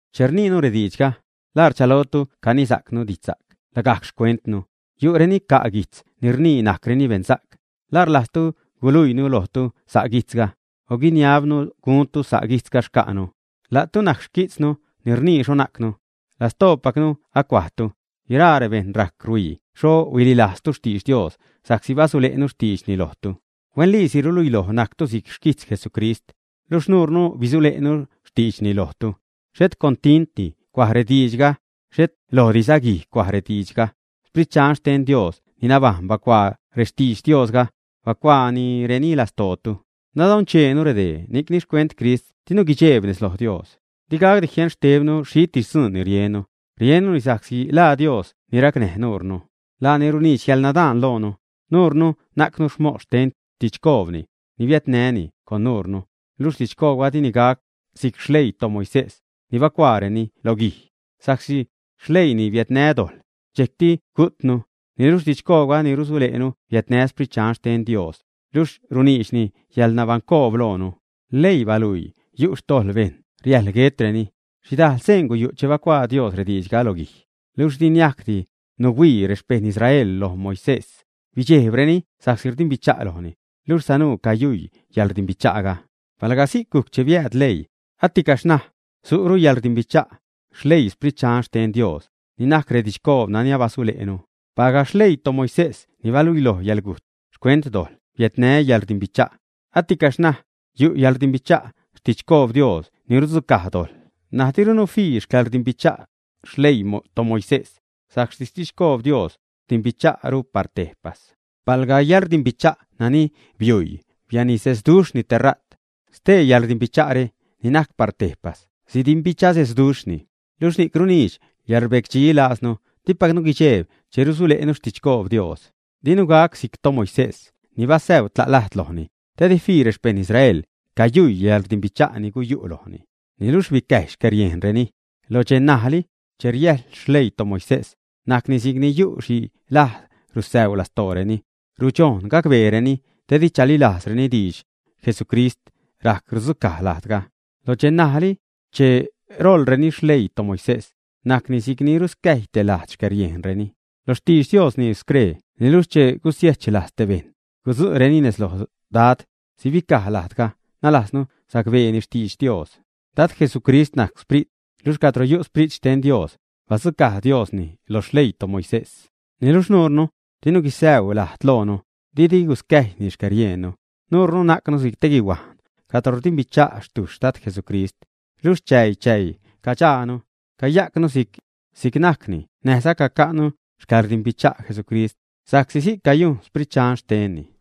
Che rniinu rediidxga, ¿la rchalotu canisacnu didxsa'c lagajc xcuentnu, ä? Yu'reni ca' guijtz ni rnii najcreni beṉsa'c. ¿La rlajzzatu guiluiinu lojtu sa' guijtzga, o guiniabnu guntu sa' guijtzga xca'nu, ä? La'tu najc si'c xquijtznu ni rnii xho najcnu. Lastoopacnu acuajtu. Guiraa rebejṉ rajc rhuii xho huililajztu xtidx Dios sa'csi basule'nu xtiidxni lojtu. Huenliisi rluiloj najctu si'c xquijtz Jesucrist, luxh nuurnu bizule'nu xtiidxni lojtu. Xhet con tintdi cuaj rediidxga, xhet lojdiza guij cuaj diidxga, Sprit Dxan xten Dios ni nabajṉ bacuaa rextidx Diosga, bacuaanireni lastootu. Nadoncheenu redee, ni'cni xcuent Crist dinu guidxejb nez loj Dios. Di gacdi jieṉ xtebnu xhitis dzuun ni riennu, riennuni sa'csi laa Dios ni racnäj nuurnu. Laani runiidx yäḻnadaan loonu. Nuurnu najcnu mos xten xtidxcoobni ni bia'nni con nuurnu. Luxh didxcoobga dini gac si'c xleii toMoisés ni bacuaareni lo guij, sa'csi xleiini biädnä dojḻ, dxejc gujtnu. Niluxh didxcoobga ni rusule'nu biädnä Sprit Dxan xten Diosni, luxh runiidxni yäḻnabaṉcoob loonu. Leii baluii yu' xtojḻ bejṉ, riäjḻ guetreni. Xhidajl seen guyu' che bacuaa Dios rediidxga lo guij. Luxh di niajcdi nuhuii rexpejṉ Israel loj Moisés, bidxejbreni sa'csi rdimbicha' lojni, luxh sanuu cayuii yäḻrdimbicha'ga. Palga si'c gujc che biääd leii, aticaxh ṉaj su'ru xcäḻrdimbicha' xleii Sprit Dxan xten Dios, ni najc redidxcoob nani abasule'nu. Palga xleii toMoisés ni baluiloj yäḻgujt xcuent dojḻ biädnä yäḻrdimbicha', aticaxh ṉaj yu' xcäḻrdimbicha' xtidxcoob Dios ni rudzucaj dojḻ. N̲aj dirunu fii xcäḻrdimbicha' xleii toMoisés sa'csi xtidxcoob Dios rdimbicha'ru par tejpas. Palga yäḻrdimbicha' nani biuii bianisesduxhni tera't, stee yäḻrdimbicha're ni najc par tejpas sidimbichasesduxhni. Luxh ni'c runiidx yäḻrbecdxi lajznu, dipacnu guidxejb che rusule'nu xtidxcoob Dios. Dinu gac si'c toMoisés, ni basäu tla' lajd lojni te di fii rexpejṉ Israel cayuii yäḻrdimbicha' ni guyu' lojni. Niluxh bicäjy xcäriejnreni; lo dxej ṉajli che rieḻ xleii toMoisés, najcni si'cni yu' xhi lajd rusäuu lastooreni, rudxojn gacbeereni, te di chalilajzreni, xtidx Jesucristtis rajc rudzucaj lajdga. Lo dxe ṉajli che roḻreni xleii toMoisés, najcni si'cni ruscäjy te lajd xcäriejnreni. Lo xtidx Dios rnii scree: “Niluxh che gusiechlajz te bejṉ, gudzuréni nez loj Dad, sibicaj lajdga”, nalajznu sacbeeni xtidx Dios. Dad Jesucrist najc Sprit luxh cadro yu' Sprit xten Dios badzucaj Diosni lo xleii toMoisés. Niluxh nuure dinu gusäu lajd lojnu, didi guscäjyni xcäriejnnu. Nuure najcnu si'c te guihuajn cadro rdimbicha' xtuxh Dad Jesucrist, luxh chäi-chäi cadxaanu cayajcnu si'c najcni näjza caca'nu xcäḻrdimbicha' Jesucrist, sa'csi si'c cayujn Sprit Dxan xtenni.